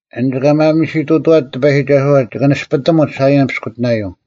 ᐊᓐᒡ ᑲ ᒪᒥᓯᑐᑐᐛᒡ ᑎᐸᔨᒋᒐᓱᐛ ᒋᑭ ᓂᔅᐱᑎᒧᒡ ᓴᐃᔭᓐ ᐱᔅᑯᑎᓇᔪᐤ,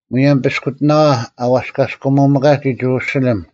ᒧᔭᒻ ᐱᔅᑯᑎᓇᐛ ᐊ ᐛᔅᑲᔅᑲᒧᒥᑲᒋ ᒋᕈᓯᓕᒻ,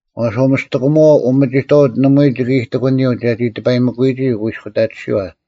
ᐛᔅ ᐅᒥᔅᑎᑯᒧᐛᐤ ᐅᒥᒋᑥᐅᒡ ᓇᒪᐎᔾ ᒋᑭ ᐃᑎᑯᓂᔪᐤ ᒐᒋ ᑎᐸᔨᒥᑯᐃᒋ ᐅᑯᐃᔅᑯᑕᑎᓯᐛ;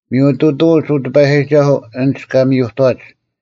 ᒥᔪᑐᑐᐅᒡ, ᐅ ᑎᐸᔨᒋᒐᓱᐤ, ᐊᓐᒡ ᑲ ᒥᔪᑥᒡ,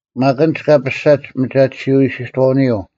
ᒪᒃ ᐊᓐᒡ ᑲ ᐱᔅᒐᒡ ᒥᒐᑎᓯᐤ ᐃᓯᑥᐅᓂᔪᐤ,